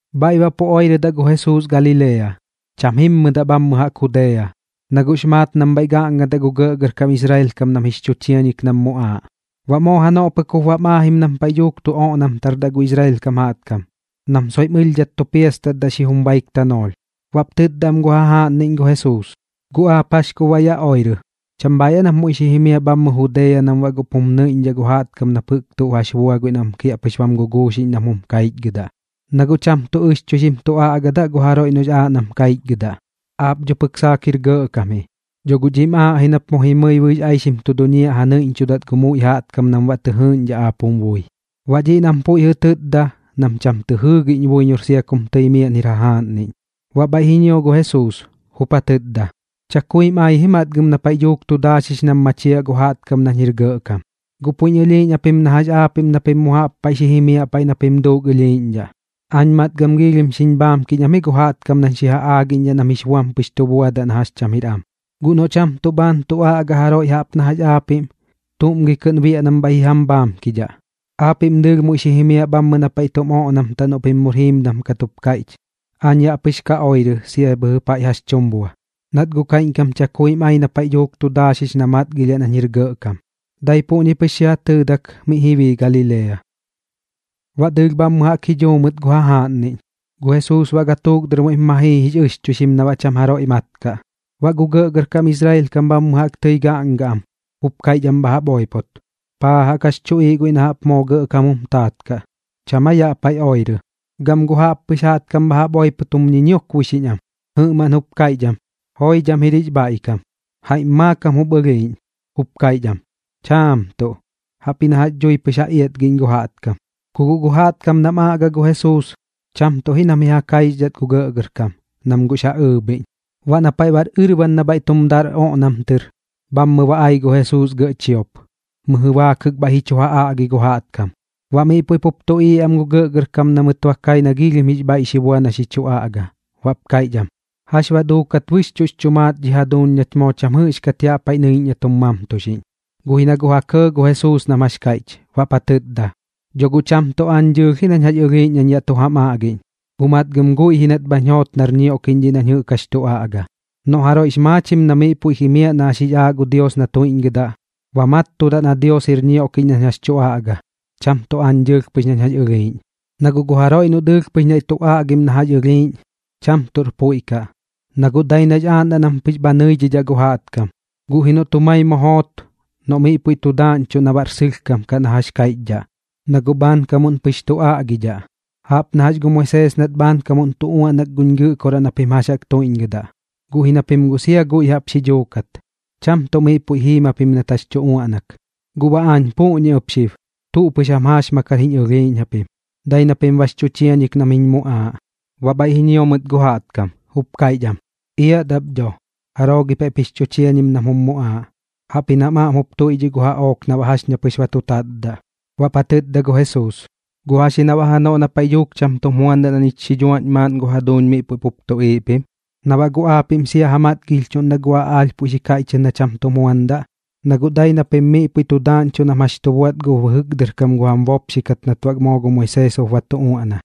Bhaiꞌ baꞌ pu oirɨdaꞌ gu Jesuus Galilea, cham jimmɨdaꞌ bhammɨ jaꞌk Judea, na guꞌx maat nam bhaiꞌ gaꞌngadaꞌ gu gɇꞌgɇrkam Israel kam nam jix chu chiañik nam muꞌaaꞌ. Baꞌ moo janoꞌ pɨk jup bam aajim nam paiꞌ dhuuk tu oꞌnamtardaꞌ gu Israel kam jaꞌtkam, nam soiꞌm ɨlhdhat tu piastatdaꞌ xijum baik tanoolh. Baꞌp tɨtda am gu jajaaꞌnniꞌñ gu Jesuus: ―¿Guꞌ aap jax kup baꞌ yaꞌ oirɨ? ¿Cham bhaiꞌ aa nap muiꞌ xi jimiaꞌ bhammɨ Judea nam baꞌ guꞌp jum nɨiꞌñdhaꞌ gu jaꞌtkam nap jɨꞌk tuꞌ jax bua guiꞌ nam kiaꞌpɨx bam guguuxiꞌñ nam jum kaichgɨdaꞌ? Na guꞌ cham tuꞌ ɨxchuixim tu aꞌgadaꞌ gu jaroiꞌ noꞌx aaꞌ nam kaichgɨdaꞌ. Aap dho pɨk saak jir gɇꞌkam ji, dho guꞌ dhiꞌm aaꞌ ji nap mu jimɨi bɨɨx aixim tu duñiaꞌ ja nɨiꞌñchudat gu muiꞌ jaꞌtkam nam baꞌ tɨ jɨɨꞌñdhaꞌ aap jum bui. Baꞌ dhiꞌ nam puiꞌ jɨꞌ tɨtda, nam cham tɨ jɨɨgiꞌñ buiñor sia kum tɨi miaꞌn jir jum jajaaꞌnnim. Baꞌ bhaiꞌ ji ñio gu Jesuus, jup ja tɨtda: ―Chakuim ai ji matgam na paiꞌ dhuuk tu daaxix nam machiaꞌ gu jaꞌtkam nañ jir gɇꞌkam. Guꞌ puiꞌñ ɨlhiiꞌñ japim na jax aapiꞌm na pim mu jaꞌp paiꞌ xi jimiaꞌ paiꞌ na pim duuk ɨlhiiꞌñdhaꞌ. Aañ matgam giilhim xiñ bhaamkiꞌñ am ji gu jaꞌtkam nañ xi ja aagiꞌñdhaꞌ nam jix buam pɨx tu buadaꞌ na jax cham jir am. Guꞌ noꞌ cham tuꞌ bhaan tu aꞌga jaroiꞌ jaꞌp na jax aapiꞌm, ¿tuꞌm gi kɨꞌn biaꞌ nam bhaiꞌ ji jam bhaamkidhaꞌ? Aapiꞌm dɨɨlh muiꞌ xi jimiaꞌ bhammɨ na paiꞌ tum oꞌnamtaꞌ noꞌ pim mur jiimdam kat jup kaiꞌch. Aañ yaꞌ pɨx ka oirɨ sia bhɨjɨ paiꞌ jax tum bua, nat guꞌ kaiꞌñkam chakuim ai na paiꞌ dhuuk tu daaxix na matgilhiaꞌ nañ jir gɇꞌkam. Dai puꞌñi pɨx xi ja tɨɨdak miꞌ ji bii Galilea. Baꞌ dɨɨlh bhammɨ jaꞌk ji dhuu mɨt gu jajaaꞌnniꞌñ, gu Jesuus baꞌ gatuuk muiꞌp ma jii jix ɨxchuixim na baꞌ cham jaroiꞌ mat kaꞌ. Baꞌ gu gɇꞌgɇrkam Israel kam bhammɨ jaꞌk tɨi gaꞌnga am, jup kaiꞌch am bha jaꞌp oipot: ―¿Paa jaꞌk jax chuꞌiiꞌ guiꞌ na jaꞌp moo gɇꞌkam jum taat kaꞌ? ¿Cham aa yaꞌ paiꞌ oirɨ? Gam gu jaꞌppɨx jaꞌtkam bha jaꞌp oipot jum ñiñiokboixiꞌñ am. Jɨꞌmaꞌn jup kaiꞌch am: “Joidham jir jix bhaiꞌkam.” Jaiꞌm maakam jup ɨlhiiꞌñ, jup kaiꞌch am: “Chaam tuꞌ, jaꞌpji na jax dhui ja iatgiꞌñ gu jaꞌtkam.” Ku guꞌ gu jaꞌtkam nam aꞌga gu Jesuus, cham tuꞌ ji nam ji ja kaixdhat gu gɇꞌgɇrkam, nam guꞌx ja ɨɨbhiꞌñ. Baꞌ na paiꞌ bar ɨrban na bhaiꞌ tum dar oꞌnam tɨr, bhammɨ ba ai gu Jesuus gɇꞌ chiop, mɨjɨ baakɨk bhaiꞌ ji chu ja aꞌgi gu jaꞌtkam. Baꞌ miꞌ puiꞌ pup tuꞌiiꞌ am gu gɇꞌgɇrkam na mɨt kai na giilhim jix bhaiꞌ xi bua na xi chu aꞌga, baꞌp kaiꞌch am: ―¿Jax baꞌ duukat bɨxchuꞌx chu maat dhi jaduuñ nach moo cham jɨꞌxkat yaꞌ paiꞌ nɨiꞌñ na tum mamtuxiꞌñ? Guꞌ ji na guꞌ ja kɇɇ gu Jesuus nam jax kaiꞌch, baꞌp ja tɨtda: ―Dho guꞌ cham tuꞌ aañ dɨɨlh ji nañ jax ɨlhiiꞌñ nañ yaꞌ tu jam aꞌgiꞌñ, guꞌ matgam guiꞌ ji nat bhañ joot nar ñioꞌkiꞌñ dhiꞌ nañ jɨꞌk jax tu aꞌga. Noꞌ jaroiꞌx maachim na miꞌ puiꞌ jimiaꞌ na jax jix aaꞌ gu Dios na tuiꞌñgɨdaꞌ, ba mattudaꞌ na Dios jir ñioꞌkiꞌñ nañ jax tu aꞌga, cham tuꞌ aañ dɨɨlh pɨx nañ jax ɨlhiiꞌñ. Na guꞌ gu jaroiꞌ noꞌ dɨɨlh pɨx naiꞌ tu aꞌgim na jax ɨlhiiꞌñ, cham tuꞌr puiꞌ kaꞌ, na guꞌ dai nax aaꞌndaꞌ nam pɨx bha nɨidhidhaꞌ gu jaꞌtkam. Guꞌ ji noꞌt jumai mu joot, noꞌ miꞌ puiꞌ tu daaꞌñchuꞌ na baꞌr sɨlhkam kaꞌ na jax kaiꞌchdhaꞌ, na guꞌ bhaankamuꞌn pɨx tu aꞌgidhaꞌ. ’Jaꞌp na jax gu Moisees nat bhaankamuꞌn tu uaꞌnak guñ Gɨꞌkoraꞌ na pim jax jaꞌk tuiꞌñgɨdaꞌ, guꞌ ji na pim guꞌ sia guiꞌ jaꞌp xi dhuukat, cham tuꞌ miꞌ puiꞌ jiim japim nat jax tu uaꞌnak. Guꞌ baꞌ aañ puꞌñi ɨp xib, tuꞌ pɨx jam jaaxmakar jiñ ɨlhiiꞌñ japim, dai na pim bax chu chiañik nam jiñ muꞌaaꞌ. Baꞌ bhaiꞌ ji ñio mɨt gu jaꞌtkam, jup kaiꞌch am: ―Iat ap dho. ¿Jaroo gi paiꞌp jix chu chiañim nam jum muꞌaaꞌ? Jaꞌpji nam aꞌm jup tuiꞌdhiꞌ gu jaꞌook na baꞌ jax ña pɨx ba tu tatdaꞌ. Baꞌp ja tɨtda gu Jesuus: ―¿Guꞌ jax ji na baꞌ janoꞌ na paiꞌ dhuuk cham tum juandaꞌ na ñich xi dhuaꞌñ maaꞌn gu jaduuñ miꞌ puiꞌ pup tuꞌiiꞌ pim? ¿Na baꞌ guꞌ aapiꞌm sia ja matgilhiꞌñdhaꞌ gu aꞌaalh puiꞌ xi kaiꞌchɨt na cham tum juandaꞌ? Na guꞌ dai na pim miꞌ puiꞌ tu daaꞌñchuꞌ nam jax tu buaꞌt gu bɨjɨk dɨr kam gu jam bopxikat nat baꞌ moo gu Moisees jup ba tu uaꞌna.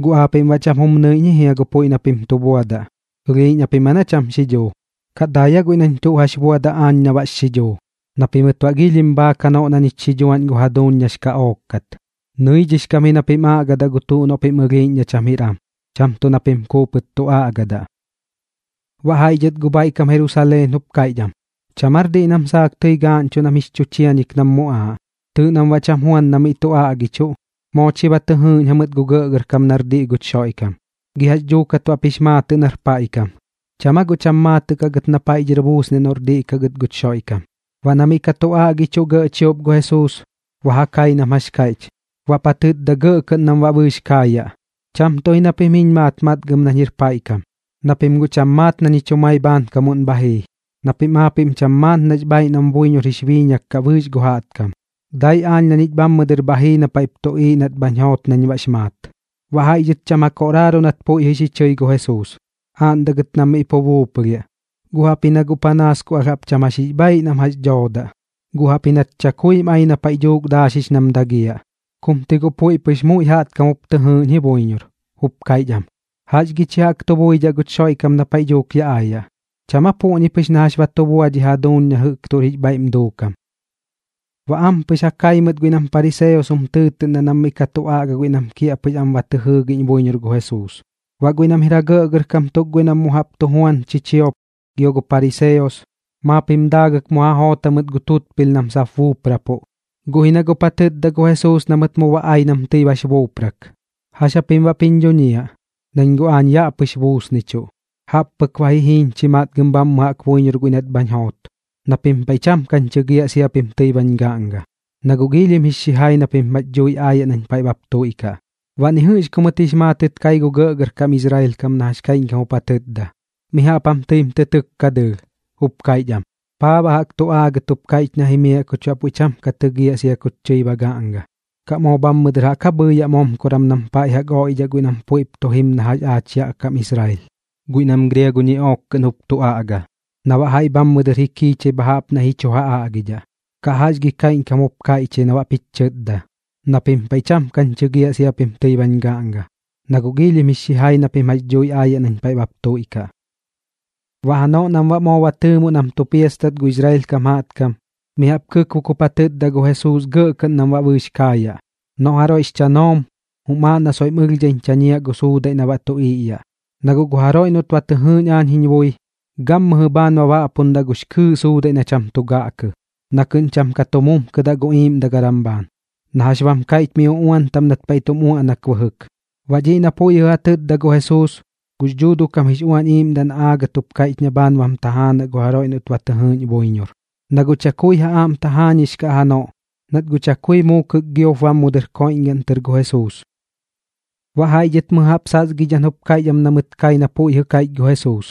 ¿Guꞌ aapiꞌm baꞌ cham jum nɨiꞌñ ji jia gu puiꞌ na pim tu buadaꞌ? ¿Ɨlhiiꞌñ japim aa na cham xidhuu, kaꞌ dai aa guiꞌ nañ tuꞌ jax buadaꞌ aañ na baꞌx xidhuu na pimɨt baꞌ giilhim bhaak janoꞌ na ñich xi dhuaꞌñ gu jaduuñ nax kaꞌook kat? Nɨidhix kam ji na pim aꞌgadaꞌ gu tuꞌ noꞌ pim ɨlhiiꞌñ na cham jir am, cham tuꞌ na pim kuupɨt tu aꞌgadaꞌ. Baꞌ jaiꞌ dhɨt gu bhaiꞌ kam Jerusaleen jup kaiꞌch am: ―¿Cham aar diꞌ nam saak tɨi gaaꞌñchuꞌ nam jix chu chiañik nam muꞌaaꞌ? Tɨɨꞌ nam baꞌ cham juan na miꞌ tu aꞌgichuꞌ. Moo chi ba tɨ jɨɨgiꞌñ am gu gɇꞌgɇrkam nar diꞌ guch Xoiꞌkam. ¿Gi jax dhuukat baꞌp jix maatɨꞌ nar paiꞌ kam? ¿Cham aa guꞌ cham maatɨꞌ kaꞌ gɨt na paiꞌ dhɨr buusniaꞌ noꞌr diꞌ kaꞌ gɨt guch Xoiꞌkam? Baꞌ na miꞌ ka tu aꞌgichuꞌ gɇꞌ chiop gu Jesuus, ba ja kai nam jax kaiꞌch, baꞌp ja tɨtda gɇꞌ kɨꞌn nam baꞌ bɨɨx kaayaꞌ: ―Cham tuꞌ ji na pim jiñ maat matgam nañ jir paiꞌ kam, na pim guꞌ cham maat na ñich jumai bhaankamuꞌn bha jii, na pim aapiꞌm cham maat nax bhaiꞌ nam buiñor jix biiñak kaꞌ bɨɨx na jɨꞌk jaꞌtkam. Dai aañ na ñich bhammɨ dɨr bha jii na paiꞌp tuꞌiiꞌ nat bhañ joot nañ baꞌx maat. Baꞌ jaiꞌ dhɨt cham ja koꞌraaru nat puiꞌ jɨꞌ xi chɨi gu Jesuus, aaꞌndaꞌ gɨt nam miꞌ pu buuplhiaꞌ, guꞌ jaꞌpji na guꞌ panaas ku alh jaꞌp cham jax jix bhaaiꞌ nam doodaꞌ, guꞌ jaꞌpji nat chakuim ai na paiꞌ dhuuk daaxix nam dagiaꞌ. Kum ti guꞌ puiꞌ pɨx muiꞌ jaꞌtkam jup tɨ jɨɨꞌñ ji buiñor, jup kaiꞌch am: ―¿Jax gi chi jaꞌk tu buidhaꞌ guch Xoiꞌkam na paiꞌ dhuuk ya aayaꞌ? ¿Cham aa puꞌñi pɨx na jax ba tu bua dhi jaduuñ na jɨꞌk tuꞌr jix bhaiꞌm duukam? Baꞌ ampɨx ja kai mɨt guiꞌ nam pariseos jum tɨɨtɨꞌndaꞌ nam miꞌ ka tu aꞌga guiꞌ nam kiaꞌpɨx am ba tɨ jɨɨgiꞌñ buiñor gu Jesuus. Baꞌ guiꞌ nam jir ja gɇꞌgɇrkam tuk guiꞌ nam mu jaꞌp tu juan chichiop gio gu pariseos, maap jum daagɨk mu ja joot jamɨt gu tutpilh nam sap buuprapuꞌ. Guꞌ ji na guꞌp ja tɨtda gu Jesuus na mɨt mu ba ai nam tɨi bax buuprak: ―¿Jax japim baꞌp jiñ dhuñiaꞌ, nañ guꞌ yaꞌ pɨx buusnichuꞌ? Jaꞌp pɨk ba ji jiiñ chi matgam bhammɨ jaꞌk buiñor guiꞌ nat bhañ joot, na pim paiꞌ cham kañ chɨgiaꞌ sia pim tɨi bañ gaꞌnga. Na guꞌ giilhim jix xijai na pim jax dhuuji aayaꞌ nañ paiꞌ bap tuiꞌkaꞌ. Baꞌ ni jɨꞌx ku mɨt jix maatɨt kai gu gɇꞌgɇrkam Israel kam na jax kaiꞌñkam jup ja tɨtda. Mi jaꞌp jam tɨim tɨ tɨkka dɨɨlh, jup kaiꞌch am: ―¿Paa baꞌ jaꞌk tu aagat jup kaiꞌch na jimiaꞌ kuch baꞌ puiꞌ cham ka tɨgiaꞌ sia kuch tɨi ba gaꞌnga? ¿Kaꞌ moo bhammɨ dɨr jaꞌk aa bhɨɨyaꞌ momkoran nam paiꞌ jaꞌk oiꞌdhaꞌ guiꞌ nam puiꞌp tu jim na jax aach yaꞌ kam Israel, guiꞌ nam griago ñiꞌook kɨꞌn jup tu aꞌga, na baꞌ jaiꞌ bhammɨ dɨr ji kiichai bha jaꞌp naiꞌ ji chu ja aꞌgidhaꞌ? ¿Kaꞌ jax gi kaiꞌñkam jup kaiꞌch ji na baꞌp jich chɨtda: “Na pim paiꞌ cham kañ chɨgiaꞌ sia pim tɨi bañ gaꞌnga, na guꞌ giilhim jix xijai na pim jax dhui aayaꞌ nañ paiꞌ bap tuiꞌkaꞌ”? Baꞌ janoꞌ nam baꞌ moo ba tɨɨmuꞌ nam tu piastat gu Israel kam jaꞌtkam, mi jaꞌp kɨkbuk jup ja tɨtda gu Jesuus gɇꞌ kɨꞌn nam baꞌ bɨɨx kaayaꞌ: ―Noꞌ jaroiꞌx chanoom, jum aaꞌ na soiꞌm ɨlhdhaiñ chañiaꞌ gu suudaiꞌ na baꞌ tu iꞌyaꞌ. Na guꞌ gu jaroiꞌ noꞌt ba tɨ jɨɨꞌñ aañ jiñ bui, gammɨjɨ bhaan ba baꞌpundaꞌ gux kɨɨꞌ gu suudaiꞌ na cham tu gaꞌkɨ, na kɨꞌn cham ka tu mumkɨdaꞌ gu iiꞌmdagaram bhaan, na jax bam kaiꞌch mi uꞌuan taꞌm nat paiꞌ tum uaꞌnak bɨjɨk. Baꞌ dhiꞌ na puiꞌ jɨꞌ ja tɨtda gu Jesuus, gux Dhuuduꞌ kam jix Uañ Iiꞌmdaꞌ na aagat jup kaiꞌch na bhaan bam tajaanaꞌ gu jaroiꞌ noꞌt ba tɨ jɨɨꞌñ buiñor. Na guꞌ chakui ja aꞌm tajaañix kaꞌ janoꞌ, nat guꞌ chakui muukɨk giop bam mu dɨr koiꞌñgaꞌn tɨr gu Jesuus. Baꞌ jaiꞌ dhɨt mɨjɨ jaꞌp sasgidhan jup kaiꞌch am na mɨt kai na puiꞌ jɨꞌ ja tɨtda gu Jesuus: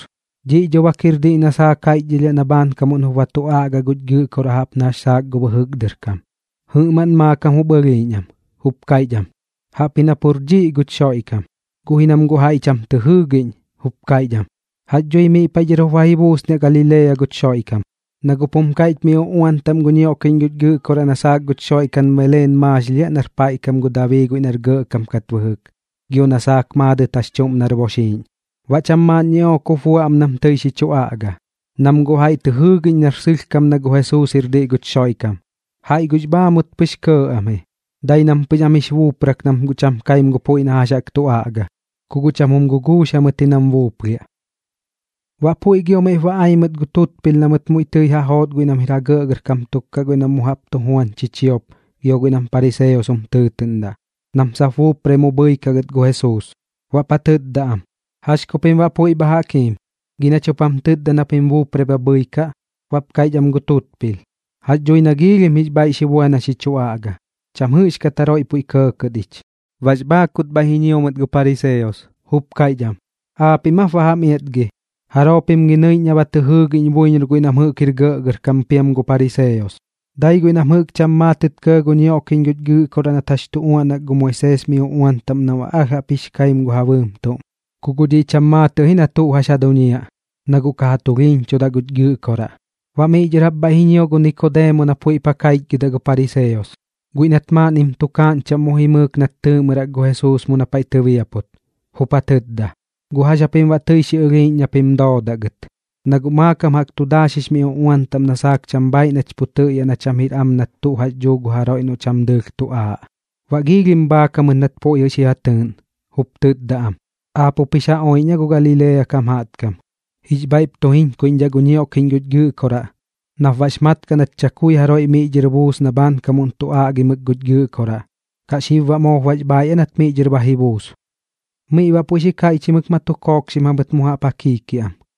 ―Dhiꞌ dho bak jir diꞌ na saak jaiꞌchdhɨlhiaꞌ na bhaankamuꞌn jup ba tu aꞌga guch Gɨꞌkoraꞌ jaꞌp na jax saak gu bɨjɨk dɨr kam. Jɨꞌmaꞌn maakam jup ɨlhiiꞌñ am, jup kaiꞌch am: ―Jaꞌpji na pur dhiꞌ guch Xoiꞌkam. Guꞌ ji nam guꞌ jaiꞌ cham tɨ jɨɨgiꞌñ, jup kaiꞌch am: ―¿Jax dhui miꞌ paiꞌ dhɨr jup ba ji buusniaꞌ Galilea guch Xoiꞌkam? Na guꞌ pum kaiꞌch mi uꞌuan taꞌm gu ñioꞌkiꞌñ guch Gɨꞌkoraꞌ na saak guch Xoiꞌkam Beleen maaxilhiaꞌ nar paiꞌ kam gu Dabii guiꞌ nar gɇꞌkam kat bɨjɨk, gio na saak maadɨt jax chuꞌm nar boxiiꞌñ. Baꞌ cham maaꞌn ñiꞌook jup bua am nam tɨi xi chu aꞌga, nam guꞌ jaiꞌ tɨ jɨɨgiꞌñ nar sɨlhkam na gu Jesuus jir diꞌ guch Xoiꞌkam, jaiꞌ guꞌx bhaamut pɨx kɇɇ am ji, dai nam pɨx am jix buuprak nam guꞌ cham kaim gu puiꞌ na jax jaꞌk tu aꞌga. Ku guꞌ cham jum guguux jamɨt ji nam buuplhiaꞌ. Baꞌ puiꞌ gio miꞌp ba ai mɨt gu tutpilh na mɨt muiꞌ tɨi ja joot guiꞌ nam jir ja gɇꞌgɇrkam tuk guiꞌ nam mu jaꞌp tu juan chichiop gio guiꞌ nam pariseos jum tɨɨtɨꞌndaꞌ, nam sap buuprai mu bhɨikaꞌ gɨt gu Jesuus. Baꞌp ja tɨtda am: ―¿Jax ku pim baꞌ puiꞌ bha jaꞌk jiim? ¿Gi nach jup jam tɨtda na pim buuprai bha bhɨikaꞌ? Baꞌp kaiꞌch am gu tutpilh: ―Jax dhui na giilhim jix bhaiꞌ xi bua na xi chu aꞌga. Cham jɨꞌxkat jaroiꞌ puiꞌ kɇɇkɇt ich. Baꞌx bhaakut bhaiꞌ ji ñio mɨt gu pariseos, jup kaiꞌch am: ―¿Aapiꞌm aap ba jam iatgi? ¿Jaroo pim gi nɨiꞌñ na ba tɨ jɨɨgiꞌñ buiñor guiꞌ nam jɨꞌk jir gɇꞌgɇrkam piam gu pariseos? Dai guiꞌ nam jɨꞌk cham maatɨt kɇɇ gu ñioꞌkiꞌñ guch Gɨꞌkoraꞌ nat jax tu uaꞌnak gu Moisees mi uꞌuan taꞌm nam baꞌ alh jaꞌp jix kaim gu ja bɨɨm tuꞌm. Ku guꞌ dhiꞌ cham maatɨꞌ ji na tuꞌ jax ja duñiaꞌ, na guꞌ ka ja tulhiiñchudaꞌ guch Gɨꞌkoraꞌ. Baꞌ miꞌ dhɨr jaꞌp bhaiꞌ ji ñio gu Nikodeemo na puiꞌp ja kaichgɨdaꞌ gu pariseos, guiꞌ nat maaꞌnnim tukaaꞌñ chaꞌm mu jimɨɨk nat tɨɨꞌmɨrak gu Jesuus mu na paiꞌ tɨbiaput, jup ja tɨtda: ―¿Guꞌ jax japim baꞌ tɨi xi ɨlhiiꞌñ na pim doodaꞌ gɨt? Na guꞌ maakam jaꞌk tu daaxix mi uꞌuan taꞌm na saak cham bhaiꞌ nach pu tɨꞌyaꞌ na cham jir am nat tuꞌ jax dhuu gu jaroiꞌ noꞌ cham dɨɨlh tu aaꞌ. Baꞌ giilhim bhaak jamɨt nat puiꞌ xi ja tɨɨꞌn, jup tɨtda am: ―¿Aap jup jix ja oiꞌñ aa gu Galilea kam jaꞌtkam? Jix bhaiꞌp tu jiñkaiꞌñdhaꞌ gu ñioꞌkiꞌñ guch Gɨꞌkoraꞌ nap baꞌx mat kaꞌ nat chakui jaroiꞌ miꞌ dhɨr buus na bhaankamuꞌn tu aꞌgimɨk guch Gɨꞌkoraꞌ. ¿Kaꞌ xib baꞌ moop bax bhaaiꞌ aa nat miꞌ dhɨr ba ji buus? Miꞌ baꞌ puiꞌ xi kaiꞌchimɨk ma tu kookxim jamɨt mu jaꞌp ja kiikiaꞌam.